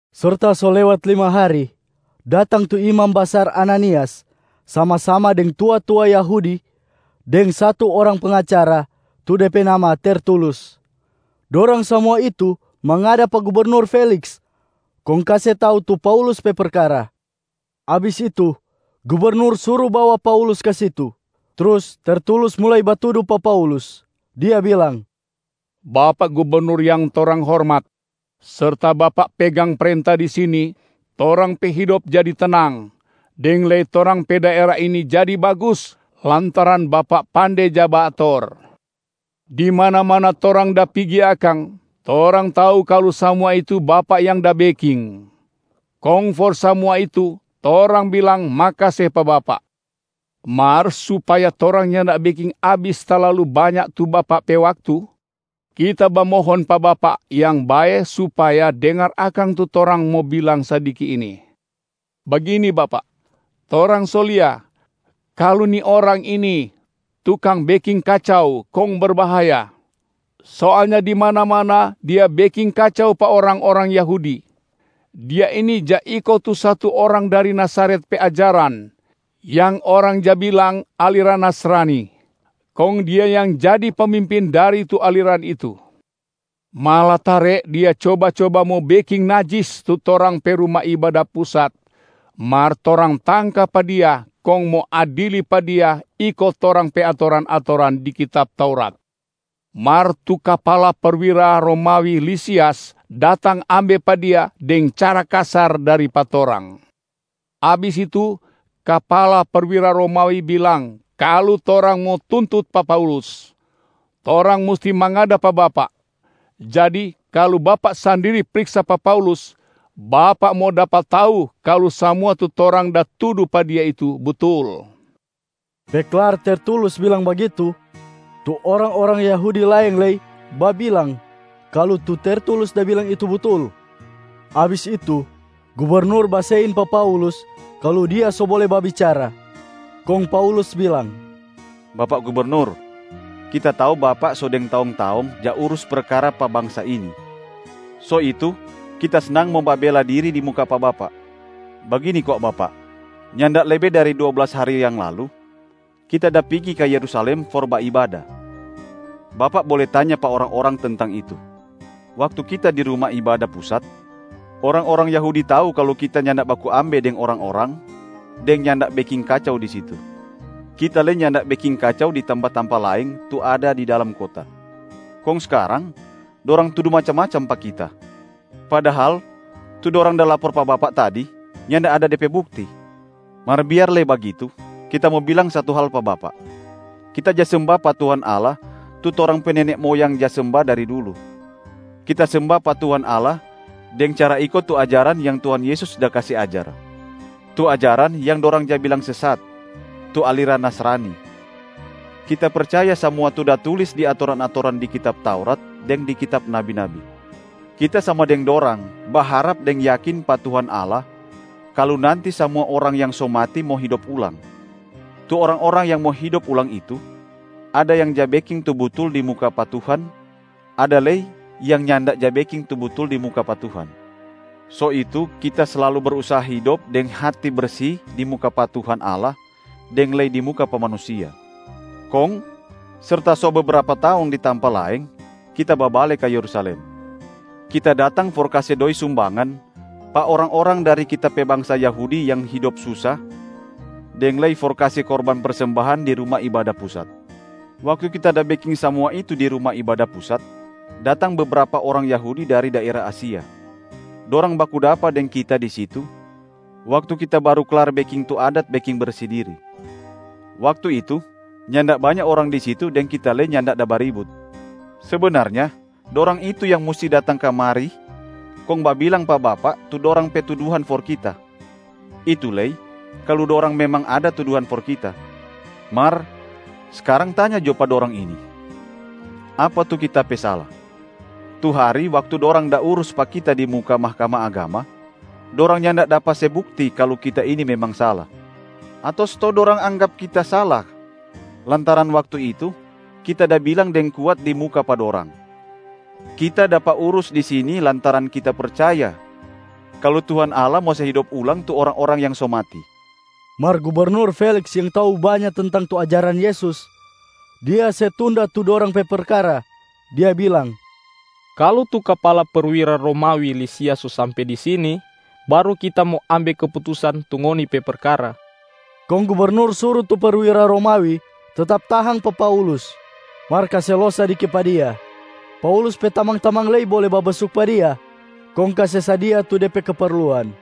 Serta so lewat lima hari, datang tu imam basar Ananias sama-sama deng tua-tua Yahudi deng satu orang pengacara tu de pe nama Tertulus. Dorang samua itu mangada pa gubernur Feliks kong kase tau tu Paulus pe perkara. Abis itu gubernur suru bawa Paulus ka situ. Trus Tertulus mulai batudu pa Paulus, dia bilang, “Bapak gubernur yang torang hormat. Serta Bapak pegang prenta di sini, torang pe hidop jadi tenang, deng lei torang pe daera ini jadi bagus lantaran bapak pande ja baator. Di mana-mana torang da pigi akang, torang tau kalu samua itu bapak yang da beking. Kong for samua itu, torang bilang makase pa bapak. Mar supaya torang nyanda beking abis talalu banya tu bapak pe waktu, kita bamohon pa bapak yang bae supaya dengar akang tu torang mo bilang sadiki ini. Bagini bapak, torang so lia kalu ni orang ini tukang beking kacau kong berbahaya. Soalnya di mana-mana dia beking kacau pa orang-orang Yahudi. Dia ini ja iko tu satu orang dari Nazaret pe ajaran, yang orang ja bilang aliran Nasrani. Kong dia yang jadi pemimpin dari tu aliran itu. Malatare dia coba-coba mo beking najis tu torang pe Ruma Ibada Pusat, mar torang tangka pa dia kong mo adili pa dia iko torang pe atoran-atoran di kitab Taurat. Mar tu kapala perwira Romawi Lisias datang ambe pa dia deng cara kasar dari pa torang. Abis itu, kapala perwira Romawi bilang kalu torang mo tuntut pa Paulus, torang musti mangada pa bapak. Jadi kalu bapak sandiri priksa pa Paulus, bapak mo dapa tau kalu samua tu torang da tudu pa dia itu butul.” Pe klar Tertulus bilang bagitu, tu orang-orang Yahudi laeng lei babilang kalu tu Tertulus da bilang itu butul. Abis itu, Gubernur basein pa Paulus kalu dia so bole babicara, kong Paulus bilang, “Bapak Gubernur, kita tau bapak so deng taong-taong ja urus perkara pa bangsa ini. So itu kita snang mo babela diri di muka pa bapak. Bagini kwa bapak, nyanda lebe dari dua blas hari yang lalu, kita da pigi ka Yerusalem for baibada. Bapak bole tanya pa orang-orang tentang itu. Waktu kita di Ruma Ibada Pusat, orang-orang Yahudi tau kalu kita nyanda baku ambe deng orang-orang deng nyanda beking kacau di situ. Kita lei nyanda beking kacau di tampa-tampa laeng tu ada di dalam kota. Kong skarang dorang tudu macam-macam pa kita, padahal tu dorang da lapor pa bapak tadi nyanda ada de pe bukti. Mar biar lei bagitu, kita mo bilang satu hal pa bapak. Kita ja semba pa Tuhan Allah tu torang pe nene moyang ja semba dari dulu. Kita semba pa Tuhan Allah deng cara iko tu ajaran yang Tuhan Yesus da kase ajar, tu ajaran yang dorang ja bilang sesat, tu aliran Nasrani. Kita percaya samua tu da tulis di atoran-atoran di kitab Taurat deng di kitab nabi-nabi. Kita sama deng dorang baharap deng yakin pa Tuhan Allah kalu nanti samua orang yang so mati mo hidop ulang. Tu orang-orang yang mo hidop ulang itu, ada yang ja beking tu butul di muka pa Tuhan, ada lei yang nyanda ja beking tu butul di muka pa Tuhan. So itu, kita slalu brusaha hidop deng hati bersi di muka pa Tuhan Allah deng lei di muka pa manusia. Kong serta so bebrapa taong di tampa laeng, kita babale ka Yerusalem. Kita datang for kase doi sumbangan pa orang-orang dari kita pe bangsa Yahudi yang hidop susa deng lei for kase korban persembahan di Ruma Ibada Pusat. Waktu kita da beking samua itu di Ruma Ibada Pusat, datang bebrapa orang Yahudi dari daera Asia. Dorang baku dapa deng kita di situ waktu kita baru klar beking tu adat beking bersi diria. Waktu itu, nyanda banya orang di situ deng kita lei nyanda da baribut. Sebenarnya dorang itu yang musti datang kamari kong babilang pa bapak tu dorang pe tuduhan for kita. Itu lei kalu dorang memang ada tuduhan for kita. Mar skarang tanya jo pa dorang ini, apa tu kita pe sala. Tu hari waktu dorang da urus pa kita di muka Mahkamah Agama, dorang nyanda dapa se bukti kalu kita ini memang sala. Ato stou dorang anggap kita sala lantaran waktu itu kita da bilang deng kuat di muka pa dorang, ‘Kita dapa urus di sini lantaran kita percaya kalu Tuhan Allah mo se hidop ulang tu orang-orang yang so mati.’” Mar gubernur Feliks yang tau banya tentang tu ajaran Yesus, dia se tunda tu dorang pe perkara, dia bilang, “Kalu tu kapala perwira Romawi Lisias so sampe di sini, baru kita mo ambe keputusan tu ngoni pe perkara.” Kong gubernur suru tu perwira Romawi tetap tahang pa Paulus, mar kase los sadiki pa dia. Paulus pe tamang-tamang lei bole babesuk pa dia kong kase sadia tu de pe keperluan.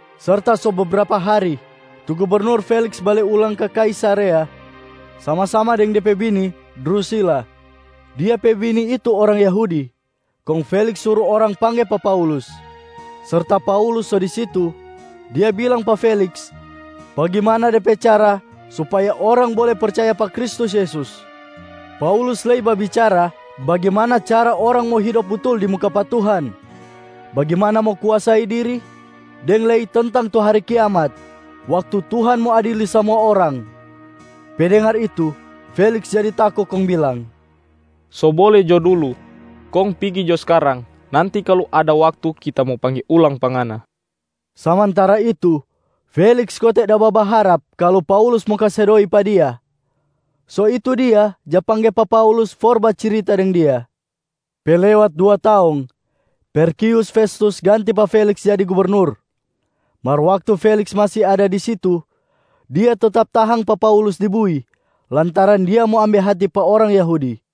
Serta so bebrapa hari, tu gubernur Feliks bale ulang ka Kaisarea sama-sama deng de pe bini Drusila. Dia pe bini itu orang Yahudi. Kong Feliks suru orang pangge pa Paulus. Serta Paulus so di situ, dia bilang pa Feliks bagimana de pe cara supaya orang bole percaya pa Kristus Yesus. Paulus lei babicara bagimana cara orang mo hidop butul di muka pa Tuhan, bagimana mo kuasai diri, deng lei tentang tu hari kiamat, waktu Tuhan mo adili samua orang. Pe dengar itu, Feliks jadi tako kong bilang, “So bole jo dulu, kong pigi jo skarang. Nanti kalu ada waktu kita mo pangge ulang pa ngana.” Samantara itu, Feliks kote da babaharap kalu Paulus mo kase doi pa dia. So itu dia ja pangge pa Paulus for bacirita deng dia. Pe lewat dua taong, Perkius Festus ganti pa Feliks jadi gubernur. Mar waktu Feliks masi ada di situ dia tetap tahang pa Paulus di bui lantaran dia mo ambe hati pa orang Yahudi.